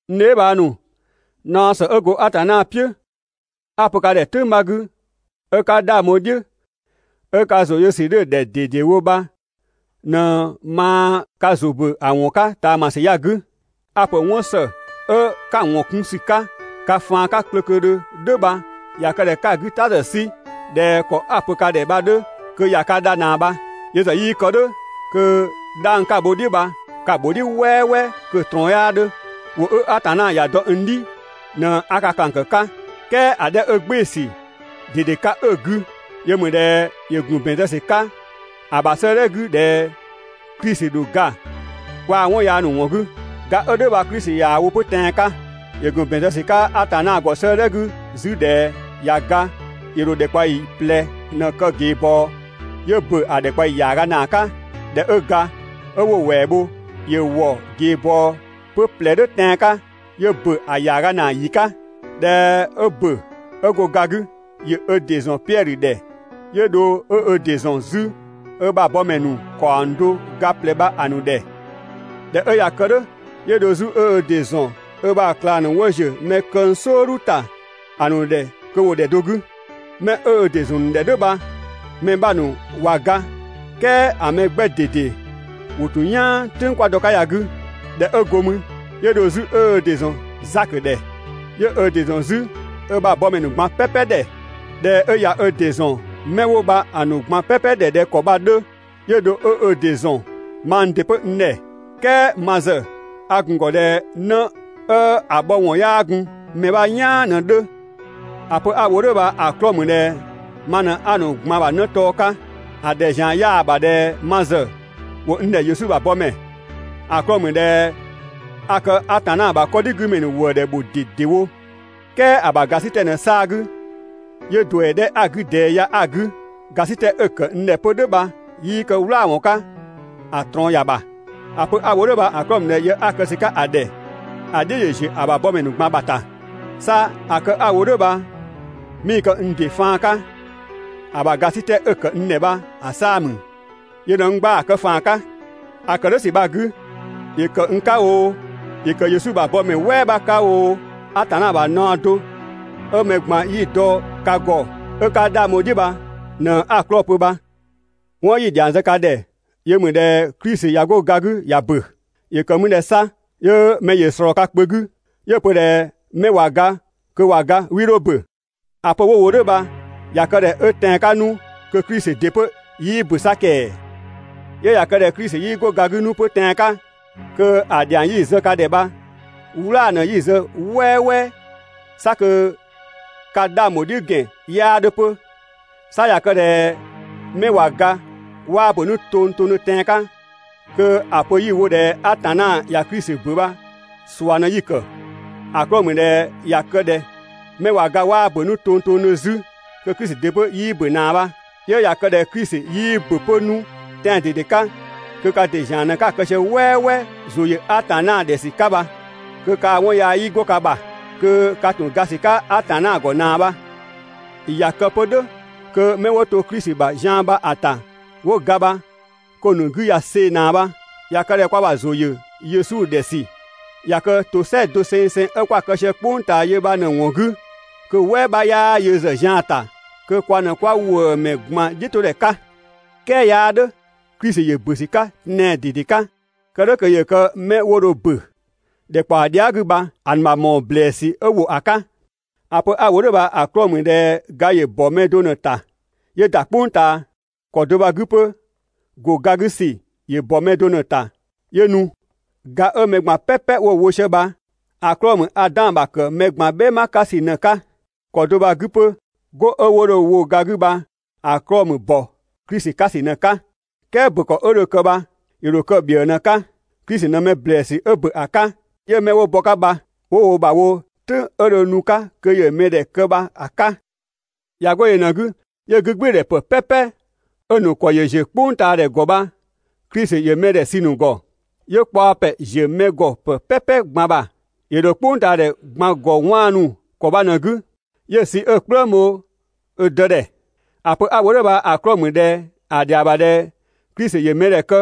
N dheebhang ‑nu, naɔ ‑së 'ö go Atanna "piʋ̈ 'a‑ pö ka ‑dhɛ "tʋ̈ng 'bha 'gü, 'ö 'ka 'dhang bho‑ "dhiʋ̈ 'ö ka ‑zʋ yö ‑sü 'dhö‑ ‑dhɛ ꞊dedewo bha ꞊në maa ka ‑zʋ ‑bö ‑a ‑wɔn 'ka ꞊taamasü ya‑ 'gü. A‑ ‑pö 'wɔn ‑së 'ö 'ka‑ ‑wɔn 'kun ‑sü 'ka ka faan 'ka klöklödhö "dhʋ̈ bha ꞊ya kë ꞊dhɛ 'ka‑ 'gü ‑ta ‑zë 'sü ꞊dhɛ ‑kɔ 'a‑ pö‑ 'ka ka ‑dhɛ bha‑ 'dhö, kö ꞊ya ka dha ꞊naa bha. Yö ‑zë 'yii kë "dhʋ̈, kö 'dhang 'ka‑ bho‑ "dhiʋ̈ bha ka‑ ‑bho "dhiʋ̈ "wɛɛwɛɛ, kö‑ ꞊trɔɔn 'yaa 'dhö. ‑Wʋ 'ö Atanna ‑ya dɔ n "dhi ꞊në 'a ka ꞊klang ‑kë 'ka, "kɛɛ ‑a 'dhɛ 'ö‑ "gbɩɩ‑ ‑sü ꞊dede 'ka 'ö‑ 'gü, yö ‑mü ꞊dhɛ ‑yö ‑gun ‑bɛn zë ‑sü 'ka ‑a ‑bha 'sëëdhɛ 'gü ꞊dhɛ Klisi ‑dho ga kwaa‑ 'wɔn yaa ‑nu ‑wɔn 'gü. Ga 'ö "dhʋ̈ bha Klisi ꞊yaa‑ wo 'pö tɛan‑ 'ka. ‑Yö ‑gun ‑bɛn zë ‑sü 'ka Atanna ‑gɔ 'sëëdhɛ 'gü 'zü ꞊dhɛ ꞊ya ga ‑yö ‑dho ‑dhɛkpaɔyi ꞊plɛ ꞊në‑ kë ꞊geebɔɔ, 'yö ‑bö ‑a ‑dhɛkpaɔyi ‑yaaga ‑naa 'ka. ꞊Dhɛ 'ö ga, 'ö 'wo‑ ‑wɛɛ bho, ‑yö ‑wɔ ꞊geebɔɔ 'pö ꞊plɛ "dhʋ̈ tɛan‑ 'ka 'yö ‑bö ‑a ‑yaaga ‑naa ‑yi 'ka. ꞊Dhɛ 'ö ‑bö 'ö go ga 'gü, ‑yö ö ‑dɩ ‑zɔn Piɛdhö ‑dhɛ, 'yö dho 'ö ö ‑dɩ ‑zɔn 'zü ö ‑bha bɔmɛ ‑nu ‑kaɔng do ga ꞊plɛ bha‑ ‑nu ‑dhɛ. ꞊Dhɛ 'ö ꞊ya kë "dhʋ̈, 'yö dho 'zü 'ö ö ‑dɩ ‑zɔn ö ‑bha ꞊klang ‑nu 'wo ‑ziö mɛ këng "sɔɔdhu ‑ta ‑a ‑nu ‑dhɛ kö ‑wo ‑dhɛ do 'gü. 'Mɛ 'ö ö ‑dɩ ‑zɔn ‑nu ‑dhɛ "dhʋ̈ bha‑ mɛ 'bha ‑nu ꞊wa ga "kɛɛ ‑a mɛ 'gbɛ ꞊dede ‑wo ‑tun "yaan "tʋ̈ng 'kwa dɔ‑ 'ka ya‑ 'gü. ꞊Dhɛ 'ö go mü, 'yö dho 'zü 'ö ö ‑dɩ ‑zɔn Zakö ‑dhɛ, 'yö ö ‑dɩ ‑zɔn 'zü ö ‑bha bɔmɛ ‑nu ꞊gban "pɛpɛ ‑dhɛ. ꞊Dhɛ 'ö ꞊ya ö ‑dɩ ‑zɔn 'mɛ 'wo bha‑ ‑nu ꞊gban "pɛpɛ ‑dhɛ ꞊dhɛ ‑kɔ bha‑ 'dhö, 'yö dho 'ö ö ‑dɩ ‑zɔn mang ‑dɩ 'pö n ‑dhɛ. "Kɛɛ ma ‑zë a ‑gun ‑gɔ ꞊dhɛ 'në 'ö‑ bhɔ ‑wɔn 'yaa gun mɛ 'bha "yaan ꞊në‑ 'dhö. ‑A pö 'a‑ wo "dhʋ̈ bha‑ 'klɔɔ‑ ‑mü ꞊dhɛ ma ꞊në 'a‑ ‑nu ꞊gban bha 'në tɔɔ 'ka, ‑a ‑dhɛ ‑zian 'yaa‑ ‑bha ꞊dhɛ ma ‑zë ‑wo n ‑dhɛ Yesu ‑bha bɔmɛ, ‑a 'klɔɔ‑ ‑mü ꞊dhɛ a kë Atanna ‑bha 'kɔdhigümɛ ‑nu ‑wëëdhɛ ‑bho ꞊dedewo. "Kɛɛ ‑a ‑bha ‑gasitɛ ꞊në‑ 'saa‑ 'gü, 'yö ‑duɛ 'dhɛ 'a‑ 'gü ꞊dɛɛ ya 'a‑ 'gü. ‑Gasitɛ 'ö‑ ‑kë n ‑dhɛ 'pö "dhʋ̈ bha 'yii kë "wlaawɔn 'ka, ‑a ꞊trɔɔn ‑ya ‑bha. ‑A pö 'a‑ wo "dhʋ̈ bha‑ 'klɔɔ‑ ‑mü ꞊dhɛ yë 'a‑ kë ‑sü 'ka‑ ‑dhɛ ‑a "dhiʋ̈‑ ‑ziö ‑a ‑bha bɔmɛ ‑nu ꞊gban ‑bha ‑ta. 'Sa ‑a kë 'a‑ wo "dhʋ̈ bha 'mii‑ kë n ‑dɩ faan 'ka, ‑a ‑bha ‑gasitɛ 'ö‑ ‑kë n ‑dhɛ bha‑ 'saa‑ ‑mü. Yö ꞊në n gba‑ kë ‑faan 'ka. ‑A ‑kë "dhʋ̈ ‑sü bha‑ 'gü, ‑yö ‑kë n 'ka oo, ‑yö ‑kë Yesu ‑bha bɔmɛ "wɛɛ 'bha 'ka oo, Atanna ‑bha naɔ do 'ö mɛ ꞊gban 'yi‑ dɔ ka ‑gɔ 'ö 'ka 'dhang bho‑ "dhiʋ̈ bha ꞊në 'a‑ 'klɔɔ‑ pö bha. 'Wɔn 'yi‑ ‑dhiang zë ka ‑dhɛ yö ‑mü ꞊dhɛ Klisi ꞊ya 'go ga 'gü ꞊ya ‑bö. ‑Yö ‑kë mü ꞊dhɛ 'sa 'yö mɛ ‑yö ꞊slɔɔ ka kpö 'gü 'yö‑ pö ꞊dhɛ 'mɛ ꞊wa ga kö ꞊wa ga 'wii 'dho ‑bö? ‑A pö 'wo‑ wo "dhʋ̈ bha ꞊ya kë ꞊dhɛ 'ö tɛan‑ 'ka 'nu kö Klisi ‑dɩ 'pö 'yii ‑bö 'sa ‑kɛɛ! 'Yö ꞊ya kë ꞊dhɛ Klisi 'yii 'go ga 'gü 'nu 'pö tɛan‑ 'ka, kö ‑a ‑dhiang 'yi‑ zë ka ‑dhɛ bha "wlaa‑ ꞊në 'yi‑ zë "wɛɛwɛɛ, 'sa kö ka 'dhang ‑bho "dhiʋ̈ ‑gɛn 'yaa 'dhö 'pö. 'Sa ꞊ya kë ꞊dhɛ 'mɛ ꞊wa ga 'waa ‑bö 'nu tongtongdhö tɛan‑ 'ka, kö ‑a pö 'yi‑ wo ꞊dhɛ Atanna ꞊ya Klisi ‑bö bha ꞊sua ꞊në 'yi‑ ‑kë. ‑A 'klɔɔ‑ ‑mü ꞊dhɛ ꞊ya kë ꞊dhɛ 'mɛ ꞊wa ga 'waa ‑bö 'nu tongtongdhö 'zü, kö Klisi ‑dɩ 'pö 'yii ‑bö ꞊naa bha. 'Yö ꞊ya kë ꞊dhɛ Klisi 'yii ‑bö 'pö 'nu tɛan‑ ꞊dede 'ka kö ka ‑dɩ ‑zian ꞊në 'ka‑ kë sië "wɛɛwɛɛ ‑zʋ ‑yö Atanna ‑dhɛ ‑sü 'ka bha, kö kaa‑ 'wɔn yaa 'yii 'go ka ‑bha, kö ka ‑tun ga ‑sü 'ka Atanna ‑gɔ ꞊naa bha. ꞊Ya kë 'pö "dhʋ̈ kö 'mɛ 'wo to Klisi ‑bha zian bha‑ ‑ta 'wo ga bha kö‑ ‑nu 'gü ꞊ya see‑ ꞊naa bha. ꞊Ya kë ꞊dhɛ kwa ‑bha ‑zʋ ‑yö Yesu ‑dhɛ ‑sü ꞊ya kë ‑tosɛa dosengseng 'ö 'kwa‑ kë sië "kpʋng ꞊taa yö bha ꞊në‑ ‑wɔn 'gü, kö‑ "wɛɛ 'bha 'yaa yö ‑zë zian‑ ‑ta, kö kwa ꞊në 'kwa ‑wëëmɛ ꞊gban "dhiʋ̈todhɛ 'ka. "Kɛɛ 'yaa "dhʋ̈, Klisi ‑yö ‑bö ‑sü 'ka tɛan‑ ꞊dede 'ka, kë "dhʋ̈ kö ‑yö kë 'mɛ 'wo dho ‑bö ‑dhɛkpaɔ dhia" 'gü bha‑ ‑nu ‑bha ‑mɔɔ ‑blɛɛsü 'ö ‑wo ‑a 'ka. ‑A pö 'a‑ wo "dhʋ̈ bha‑ 'klɔɔ‑ ‑mü ꞊dhɛ ga ‑yö ‑bɔ mɛ do ꞊në‑ ‑ta 'yö ‑da "kpʋng ꞊taa, ‑kɔ do bha‑ 'gü 'pö ‑go ga 'gü ‑sü ‑yö ‑bɔ mɛ do ꞊në‑ ‑ta 'yö nu. Ga 'ö mɛ ꞊gban "pɛpɛ 'wo‑ wo sië bha‑ 'klɔɔ‑ ‑mü Adan ‑bha ‑kë mɛ ꞊gban "bhɛma 'ka ‑sü ꞊në‑ 'ka. ‑Kɔ do bha‑ 'gü 'pö 'go 'ö 'wo dho‑ wo ga 'gü bha‑ 'klɔɔ‑ ‑mü ‑bɔ Klisi 'ka ‑sü ꞊në‑ 'ka. "Kɛɛ ‑bö ‑kɔ 'ö dho kë bha ‑yö ‑dho kë ‑bhiëë ꞊në‑ 'ka. Klisi ꞊në mɛ ‑blɛɛsü 'ö ‑bö ‑a 'ka, 'yö 'mɛ 'wo bɔ‑ 'ka bha 'wo wo ‑bha wo "tʋ̈ng 'ö dho nu‑ 'ka kö ‑yö mɛ ‑dhɛ kë bha‑ 'ka. ꞊Ya 'go yö ꞊në‑ 'gü 'yö 'gügbɩɩdhɛ ‑pë "pɛpɛ 'ö‑ ‑nu ‑kɔ ‑yö ‑ziö "kpʋngtaadhɛ ‑gɔ bha Klisi ‑yö mɛdhɛ sü‑ ‑nu ‑gɔ, 'yö kpaɔ ‑pɛ ‑ziö mɛ ‑gɔ ‑pë "pɛpɛ ꞊gban ‑bha, ‑yö ‑dho "kpʋngtaadhɛ ꞊gban ‑gɔ 'waanu ‑kɔ bha ꞊në‑ 'gü 'yö‑ sü 'ö‑ "kplëng bho ö dë ‑dhɛ. ‑A pö 'a‑ wo "dhʋ̈ bha‑ 'klɔɔ‑ ‑mü ꞊dhɛ ‑a ‑dhɛa ‑bha ꞊dhɛ Klisi ‑yö mɛdhɛ kë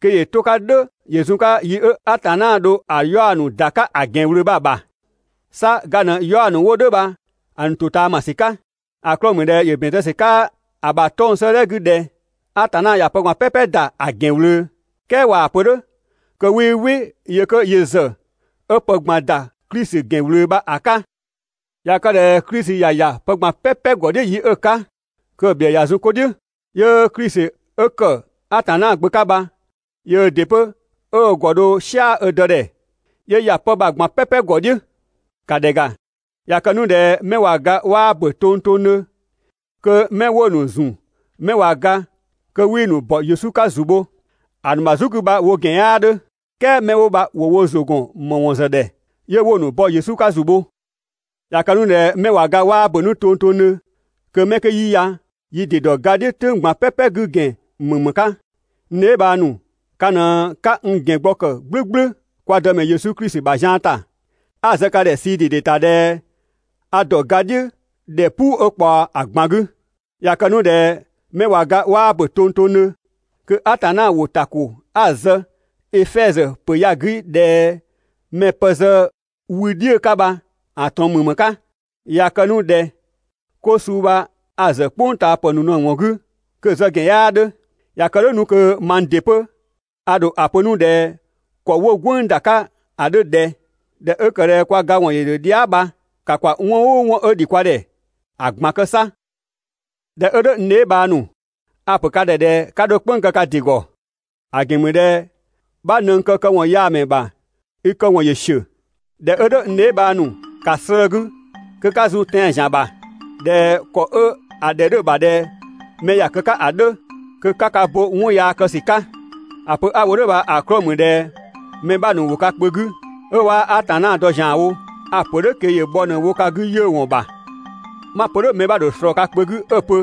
kö ‑yö 'to‑ 'ka "dhʋ̈ ‑yö zun‑ 'ka 'yi 'ö Atanna dho‑ 'yaɔ‑ ‑nu ‑da 'ka ‑a ‑gɛn ꞊wlöö bha‑ ‑bha. 'Sa ga ꞊në‑ 'yaɔ‑ ‑nu 'wo "dhʋ̈ bha‑ ‑nu ‑totaamasü 'ka. ‑A 'klɔɔ‑ ‑mü ꞊dhɛ ‑yö ‑bɛn zë ‑sü 'ka ‑a ‑bha 'tɔng‑ 'sëëdhɛ 'gü ꞊dhɛ: «Atanna ꞊ya pë ꞊gban "pɛpɛ ‑da ‑a ‑gɛn ꞊wlöö.» "Kɛɛ ꞊waa‑ pö "dhʋ̈ kö 'wii "wɩ yö 'kö yö ‑zë 'ö pë ꞊gban ‑da Klisi ‑gɛn ꞊wlöö bha‑ 'ka. ꞊Ya kë ꞊dhɛ Klisi ꞊ya ‑ya pë ꞊gban "pɛpɛ ‑gɔ "dhiʋ̈ yi 'ö‑ 'ka, kö‑ ‑bhiëë ꞊ya zun 'ko "dhiʋ̈, 'yö Klisi 'ö ‑kë Atanna Gbö 'ka bha yöö ‑dɩ 'pö 'ö ö ‑gɔ dho "sia‑ ö Dë ‑dhɛ, 'yö ‑ya 'pë bha‑ ꞊gban "pɛpɛ ‑gɔ "dhiʋ̈. ‑Ka ‑dhɛ ‑ga, ꞊ya kë 'nu ꞊dhɛ 'mɛ ꞊wa ga 'waa ‑bö tongtongdhö kö 'mɛ 'wo‑ ‑nu ‑zu 'mɛ ꞊wa ga (kö 'wii‑ ‑nu ‑bɔ Yesu 'ka ‑zu bho) ‑a ‑nu ‑bha "zu 'gü bha‑ wo ‑gɛn 'yaa 'dhö. "Kɛɛ 'mɛ 'wo bha ‑wo wo ‑zʋ ‑gɔn ‑më ‑wɔn ‑zë ‑dhɛ 'yö 'wo‑ ‑nu ‑bɔ Yesu 'ka ‑zu bho? ꞊Ya kë 'nu ꞊dhɛ 'mɛ ꞊wa ga 'waa ‑bö 'nu tongtongdhö kö 'mɛ 'kö 'yi ya yi ‑dɩ ‑dɔ ga "dhiʋ̈ "tʋ̈ng ꞊gban "pɛpɛ 'gü ‑gɛn ‑mü ‑më 'ka? N dheebhang ‑nu, ka ꞊në 'ka n ‑gɛn gbɔ ‑kë "gblʋ̈gblʋ̈ kwa Dëmɛ Yesu Klisi ‑bha zian ‑ta. 'A‑ zë ka ‑dhɛ ꞊sii ꞊dede ‑ta ꞊dhɛ a ‑dɔ ga "dhiʋ̈ ‑dhɛ "puu 'ö ꞊kpaɔ ‑a ꞊gban 'gü. ꞊Ya kë 'nu ꞊dhɛ 'mɛ ꞊wa ga 'waa ‑bö tongtongdhö, (kö Atanna ‑wʋ) ‑ta ‑ko 'a‑ zë Efɛzö ‑pö ya‑ 'gü ꞊dhɛ mɛ‑ pë zë wü "dhiʋ̈‑ 'ka bha‑ ꞊trɔɔn ‑mü ‑më 'ka? ꞊Ya kë 'nu ꞊dhɛ 'ko suu bha a‑ ‑zë "kpʋngtaapë ꞊në‑ ‑wɔn 'gü, kö‑ zë ‑gɛn 'yaa 'dhö. ꞊Ya kë "dhʋ̈ 'nu kö mang ‑dɩ 'pö a ‑dho ‑a pö 'nu ꞊dhɛ ‑kɔ 'wo‑ "gwënng ‑da 'ka ‑a 'dhö ꞊dhɛ: «꞊Dhɛ 'ö ‑kë ꞊dhɛ kwa ga ‑wɔn ‑yö ‑dhö dhia" bha, ‑ka ‑kwa 'wɔn "ʋʋ 'wɔn 'ö ‑dhi kwa ‑dhɛ ‑a ꞊gban kë 'sa.» ꞊Dhɛ 'ö "dhʋ̈ n dheebhang ‑nu, a‑ ‑pö ka ‑dhɛ ꞊dhɛ 'ka 'dho "kpënng‑ kë ka ‑dɩ ‑gɔ. ‑A ‑gɛn ‑mü ꞊dhɛ: «'Bha ꞊nëng këkɔyaamɛ ‑bha i kë ‑kɔ ‑yö ‑siö.» ꞊Dhɛ 'ö "dhʋ̈ n dheebhang ‑nu, ‑ka slëë‑ ka 'gü kö 'ka zun tɛan‑ ‑zian ‑bha ꞊dhɛ ‑kɔ 'ö‑ ‑dhɛ 'dhö‑ ‑bha ‑dhɛ mɛ ‑ya kë 'ka ‑a 'dhö, kö 'ka ka bo 'wɔn yaa kë ‑sü 'ka. ‑A pö 'a‑ wo "dhʋ̈ bha‑ 'klɔɔ‑ ‑mü ꞊dhɛ mɛ 'bha ‑nu ‑wo ka kpö 'gü 'ö 'waa Atanna dɔ ‑zianwo. A‑ ‑pö "dhʋ̈ kö ‑yö bhɔ ꞊në‑ wo ka 'gü 'yiʋ̈‑ ‑wɔn ‑bha. 'Ma‑ pö "dhʋ̈ mɛ‑ ‑dho ꞊slɔɔ ka kpö 'gü 'ö‑ pö: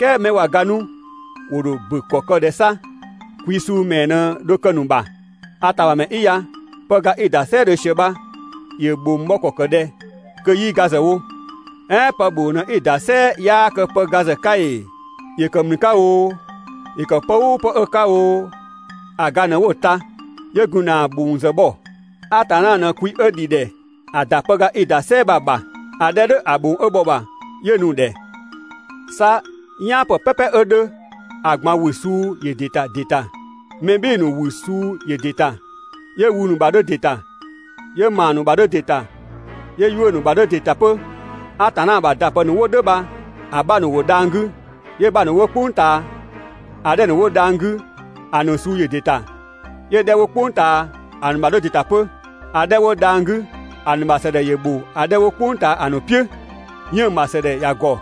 «"Kɛɛ 'mɛ ꞊wa ga 'nu ‑wo ‑dho ‑bö ‑kɔ kë ꞊dhɛ 'sa? Kwi suu ‑mɛɛ ꞊në dho kë‑ ‑nu ‑bha?» A ‑tamamɛ 'i ya, pëga 'i‑ ‑da "sɛɛdhö ꞊sië bha ‑yö ‑bhong bhɔ ‑kɔ ‑kë ꞊dhɛ kö 'yii ga ‑zë wo? "Ɛɛn pë ‑bhong ꞊në 'i‑ ‑da "sɛɛ 'yaa kë pëga ‑zë 'ka ‑ee? ‑Yö ‑kë ‑mlü 'ka oo, ‑yö ‑kë pë "ʋʋ pë 'ö‑ 'ka oo, ‑a ga ꞊në 'wo‑ ta, 'yö gun ‑na ‑bhong ‑zë bhɔ. Atanna ꞊në kwi 'ö ‑dhi ‑dhɛ ‑a ‑da pëga 'i‑ ‑da "sɛɛ bha‑ ‑bha, ‑a 'dhɛ 'ö "dhʋ̈ ‑a ‑bhong 'ö bhɔ‑ ‑bha 'yö‑ nu‑ ‑dhɛ. 'Sa "yaanpë "pɛpɛ 'ö 'dhö, ‑a ꞊gban ‑wü suu ‑yö ‑dɩ ‑ta ‑dɩ ‑ta. Mɛ "bhɩɩ‑ ‑nu ‑wü suu ‑yö ‑dɩ ‑ta, 'yö wü ‑nu ‑bha 'dhö ‑dɩ ‑ta, 'yö ‑maa ‑nu ‑bha 'dhö ‑dɩ ‑ta, 'yö 'yuʋ̈‑ ‑bha 'dhö ‑dɩ ‑ta 'pö. Atanna ‑bha ‑dapë ‑nu 'wo "dhʋ̈ bha‑ 'bha ‑nu ‑wo dhang‑ 'gü, 'yö‑ 'bha ‑nu 'wo "kpʋng ꞊taa. ‑A 'dhɛ ‑nu 'wo dhang‑ 'gü ‑a ‑nu suu ‑yö ‑dɩ ‑ta, 'yö‑ 'dhɛ 'wo "kpʋng ꞊taa ‑a ‑nu ‑bha 'dhö ‑dɩ ‑ta 'pö. ‑A 'dhɛ 'wo dhang‑ 'gü ‑a ‑nu ‑bha ‑sëdhɛ ‑yö ‑bho ‑a 'dhɛ 'wo "kpʋng ꞊taa ‑a ‑nu "piʋ̈. 'Yënng‑ ‑bha ‑sëdhɛ ‑ya ‑gɔ,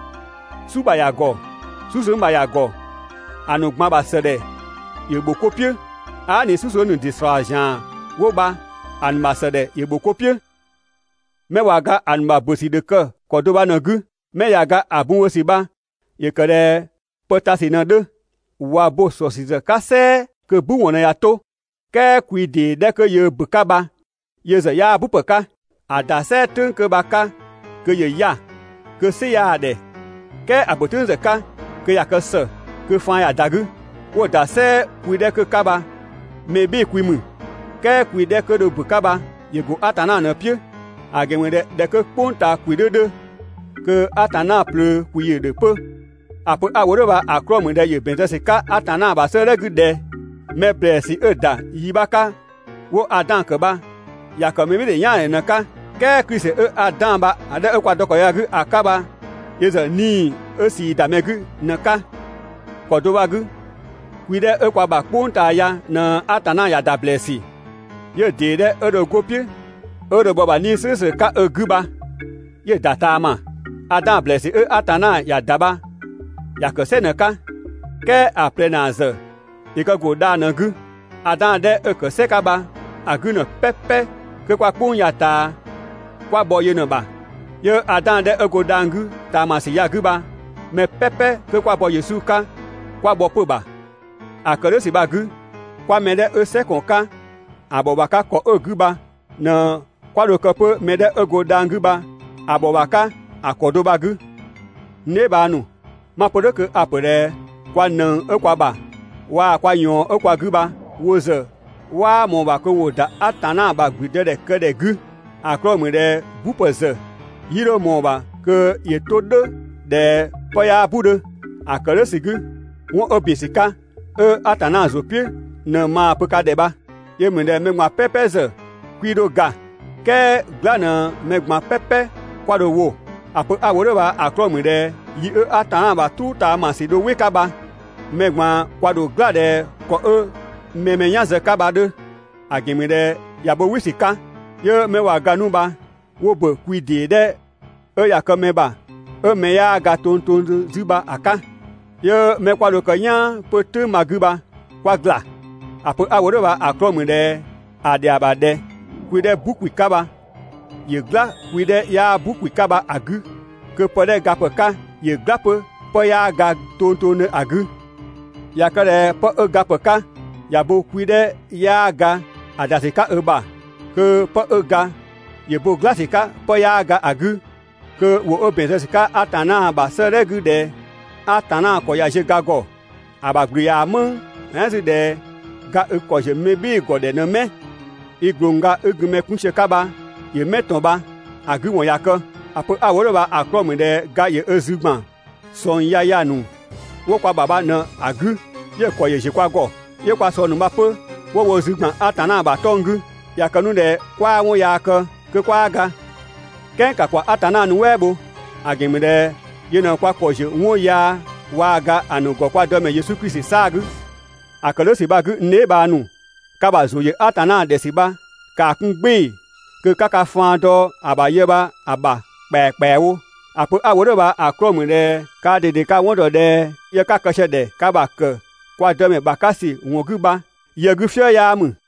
"su ‑bha ‑ya ‑gɔ, "susëng ‑bha ‑ya ‑gɔ, ‑a ‑nu ꞊gban ‑bha ‑sëdhɛ ‑yö ‑bho 'ko "piʋ̈, aa" ꞊ni "susëng ‑nu ‑dɩ ‑slɔɔ ‑zian 'wo bha, ‑a ‑nu ‑bha ‑sëdhɛ ‑yö ‑bho 'ko "piʋ̈. 'Mɛ ꞊wa ga ‑a ‑nu ‑bö ‑sü ‑dho kë ‑kɔ do bha ꞊në‑ 'gü, 'mɛ ꞊ya ga ‑a bun bho ‑sü bha ‑yö kë ꞊dhɛ pë ta ‑sü ꞊në‑ 'dhö. ꞊Wa bo‑ ‑sɔ ‑sü ‑zë 'ka "sɛɛ kö‑ "bu ‑wɔn ꞊në ꞊ya 'to. "Kɛɛ kwi ‑dee 'dhɛ 'kö yöö ‑bö 'ka bha yö ‑zë 'yaa "bupë 'ka. ‑A ‑da "sɛɛ "tʋ̈ng 'kö bha‑ 'ka, kö ‑yö 'ya‑, kö "sɩ 'yaa‑ ‑dhɛ, "kɛɛ ‑a ‑bö "tʋ̈ng ‑zë 'ka kö ꞊ya kë ‑së, kö faan ꞊ya ‑da 'gü. 'Wo‑ ‑da "sɛɛ kwi 'dhɛ 'kö‑ 'ka bha mɛ "bhɩɩ‑ kwi ‑mü, "kɛɛ kwi 'dhɛ 'kö dho ‑bö 'ka bha ‑yö ‑go Atanna ꞊në‑ "piʋ̈. ‑A ‑gɛn ‑mü ꞊dhɛ ꞊dhɛ 'kö "kpʋng ꞊taa ‑kwi 'dhö 'dhö, kö Atanna ꞊plöö ‑kwi ‑yö ‑dhö 'pö. ‑A pö 'a‑ wo "dhʋ̈ bha‑ 'klɔɔ‑ ‑mü ꞊dhɛ ‑yö ‑bɛn zë ‑sü 'ka Atanna ‑bha 'sëëdhɛ 'gü ꞊dhɛ: «Mɛ ‑blɛɛsü 'ö‑ ‑da yi 'bha 'ka 'wo‑ Adan ‑kë bha ‑ya ‑kë mɛbhɩɩdhe "yaandhe ꞊në‑ 'ka, "kɛɛ Klisi 'ö Adan bha‑ 'dhɛ kwa dɔ ‑kɔ ya‑ 'gü ‑a 'ka bha yö ‑zë 'Nii‑ 'ö ꞊sii ‑da mɛ 'gü ꞊në‑ 'ka.» ‑Kɔ do bha‑ 'gü, kwi 'dhɛ 'ö kwa ‑bha "kpʋng ꞊taa ya ꞊në Atanna ‑ya ‑da ‑blɛɛsü, 'yö‑ ‑dee 'dhɛ 'ö dho 'go‑ "piʋ̈ 'ö dho bhɔ‑ ‑bha 'Nii‑ "slʋ̈ʋ̈slʋ̈ 'ka ö 'gü bha 'yö‑ ‑da ꞊taama. Adan ‑blɛɛsü 'ö Atanna ‑ya ‑da bha ‑ya ‑kë "sɛ ꞊në‑ 'ka. "Kɛɛ ‑a ꞊plɛ ‑naa ‑zë ‑yö kë ‑go dhang‑ ꞊në‑ 'gü. Adan 'dhɛ 'ö‑ ‑kë "sɛ 'ka bha‑ 'gü ‑në "pɛpɛ 'kö 'kwa "kpʋng ꞊taa ya kwa ‑bhɔ yö ꞊në‑ ‑bha, 'yö Adan 'dhɛ 'ö go dhang‑ 'gü ꞊taamasü ya‑ 'gü bha mɛ "pɛpɛ 'kö 'kwa bɔ Yesu 'ka 'kwa bhɔ 'pö‑ ‑bha. ‑A ‑kë "dhʋ̈ ‑sü bha‑ 'gü, 'kwa mɛ 'dhɛ 'ö "sɛ ‑kɔn 'ka ‑a ‑bhɔ ‑bha 'ka ‑kɔ do 'ö‑ 'gü bha ꞊në 'kwa dho kë 'pö mɛ 'dhɛ 'ö go dhang‑ 'gü bha‑ ‑bhɔ ‑bha 'ka ‑a ‑kɔ do bha‑ 'gü. N dheebhang ‑nu, 'ma‑ pö "dhʋ̈ kö a‑ ‑pö ꞊dhɛ kwa ꞊nëng 'ö kwa ‑bha waa‑ kwa ꞊yɔɔn 'ö kwa 'gü bha wo ‑zë 'waa ꞊mɔɔ‑ ‑bha kö ‑wo ‑da Atanna ‑bha ‑gblüdëdhɛkëdhɛ 'gü, ‑a 'klɔɔ‑ ‑mü ꞊dhɛ "bupë ‑zë 'yii 'dho ꞊mɔɔ‑ ‑bha kö ‑yö 'to "dhʋ̈ ꞊dhɛ 'pë 'yaa "bu‑ 'dhö. ‑A ‑kë "dhʋ̈ ‑sü 'gü, 'wɔn 'ö ‑bin ‑sü 'ka, 'ö Atanna ‑zʋ "piʋ̈ ꞊në maa‑ pö ka ‑dhɛ bha. Yö ‑mü ꞊dhɛ mɛ ꞊gban "pɛpɛ ‑zë 'kwii 'dho ga, "kɛɛ "gla ꞊në mɛ ꞊gban "pɛpɛ 'kwa dho‑ wo. ‑A pö 'a‑ wo "dhʋ̈ bha‑ 'klɔɔ‑ ‑mü ꞊dhɛ yi 'ö Atanna ‑bha "truu ꞊taamasü dho "wɩ‑ 'ka bha, mɛ ꞊gban kwa ‑dho "gla ꞊dhɛ ‑kɔ 'ö mɛ‑ mɛ "yan zë‑ 'ka bha‑ 'dhö. ‑A ‑gɛn ‑mü ꞊dhɛ ꞊ya bo "wɩ ‑sü 'ka, 'yö 'mɛ ꞊wa ga 'nu bha 'wo ‑bö kwi ‑dee 'dhɛ 'ö ꞊ya kë mɛ ‑bha 'ö mɛ 'yaa ga tongtongdhö 'zü bha‑ 'ka, 'yö 'mɛ 'kwa dho kë "yaan 'pö "tʋ̈ng bha‑ 'gü bha 'kwa ‑gla. ‑A pö 'a‑ wo "dhʋ̈ bha‑ 'klɔɔ‑ ‑mü ꞊dhɛ ‑a ‑dhɛa ‑bha ꞊dhɛ kwi 'dhɛ "bu ‑kwi 'ka bha ‑yö "gla kwi 'dhɛ 'yaa "bu bha‑ 'gü kö pë 'dhɛ gapë 'ka ‑yö "gla 'pö 'pë 'yaa ga tongtongdhö ‑a 'gü. ꞊Ya kë ꞊dhɛ 'pë 'ö gapë 'ka ꞊ya bo kwi 'dhɛ 'yaa ga ‑a ‑da ‑sü 'ka ö ‑bha, kö 'pë 'ö ga ‑yö bo "gla ‑sü 'ka 'pë 'yaa ga ‑a 'gü, kö ‑wʋ 'ö ‑bɛn zë ‑sü 'ka Atanna ‑bha 'sëëdhɛ 'gü ꞊dhɛ: «Atanna ‑kɔ ꞊ya ziö ga ‑gɔ, ‑a ‑bha ‑gblü ꞊yaa‑ "mëng.» "Ɛɛn 'zü ꞊dhɛ: «Ga i ‑kɔ ‑ziö mɛ "bhɩɩ‑ ‑gɔ ‑dhɛ ꞊në 'mɛ? I ꞊glongga 'i gun mɛ 'kun sië‑ 'ka bha ‑yö 'mɛ ꞊tɔn bha?» ‑a 'gü ‑wɔn ꞊ya kë. ‑A pö 'a‑ wo "dhʋ̈ bha‑ 'klɔɔ‑ ‑mü ꞊dhɛ ga ‑yö ö zü ‑gban ꞊sɔng yaya ‑nu 'wo kwa ‑bha bha ꞊në‑ 'gü 'yö‑ ‑kɔ ‑yö ‑ziö kwa ‑gɔ. 'Yö kwa ꞊sɔng ‑nu bha 'pö 'wo wo zü ‑gban Atanna ‑bha 'tɔng‑ 'gü. ꞊Ya kë 'nu ꞊dhɛ 'kwaa 'wɔn yaa kë, kö 'kwaa ga. "Kɛɛ ‑ka ‑kwa Atanna nuɛ" bho, ‑a ‑gɛn ‑mü ꞊dhɛ yö ꞊në kwa ‑kɔ ‑ziö 'wɔn yaa waa‑ ga ‑a ‑nu ‑gɔ kwa Dëmɛ Yesu Klisi 'saa‑ 'gü. ‑A ‑kë "dhʋ̈ ‑sü bha‑ 'gü n dheebhang ‑nu, ka ‑bha ‑zʋ ‑yö Atanna ‑dhɛ ‑sü bha ‑kaa 'kun "gbɩɩ‑ kö 'ka ka faan dɔ ‑a ‑bha yë bha‑ ‑bha ‑kpɛakpɛawo. ‑A pö 'a‑ wo "dhʋ̈ bha‑ 'klɔɔ‑ ‑mü ꞊dhɛ kaa ꞊dede ka‑ 'wɔn ‑dɔ ꞊dhɛ yë 'ka‑ kë sië‑ ‑dhɛ ka ‑bha ‑kë kwa Dëmɛ ‑bha 'ka ‑sü ‑wɔn 'gü bha yë 'gü "fië 'yaa ‑mü.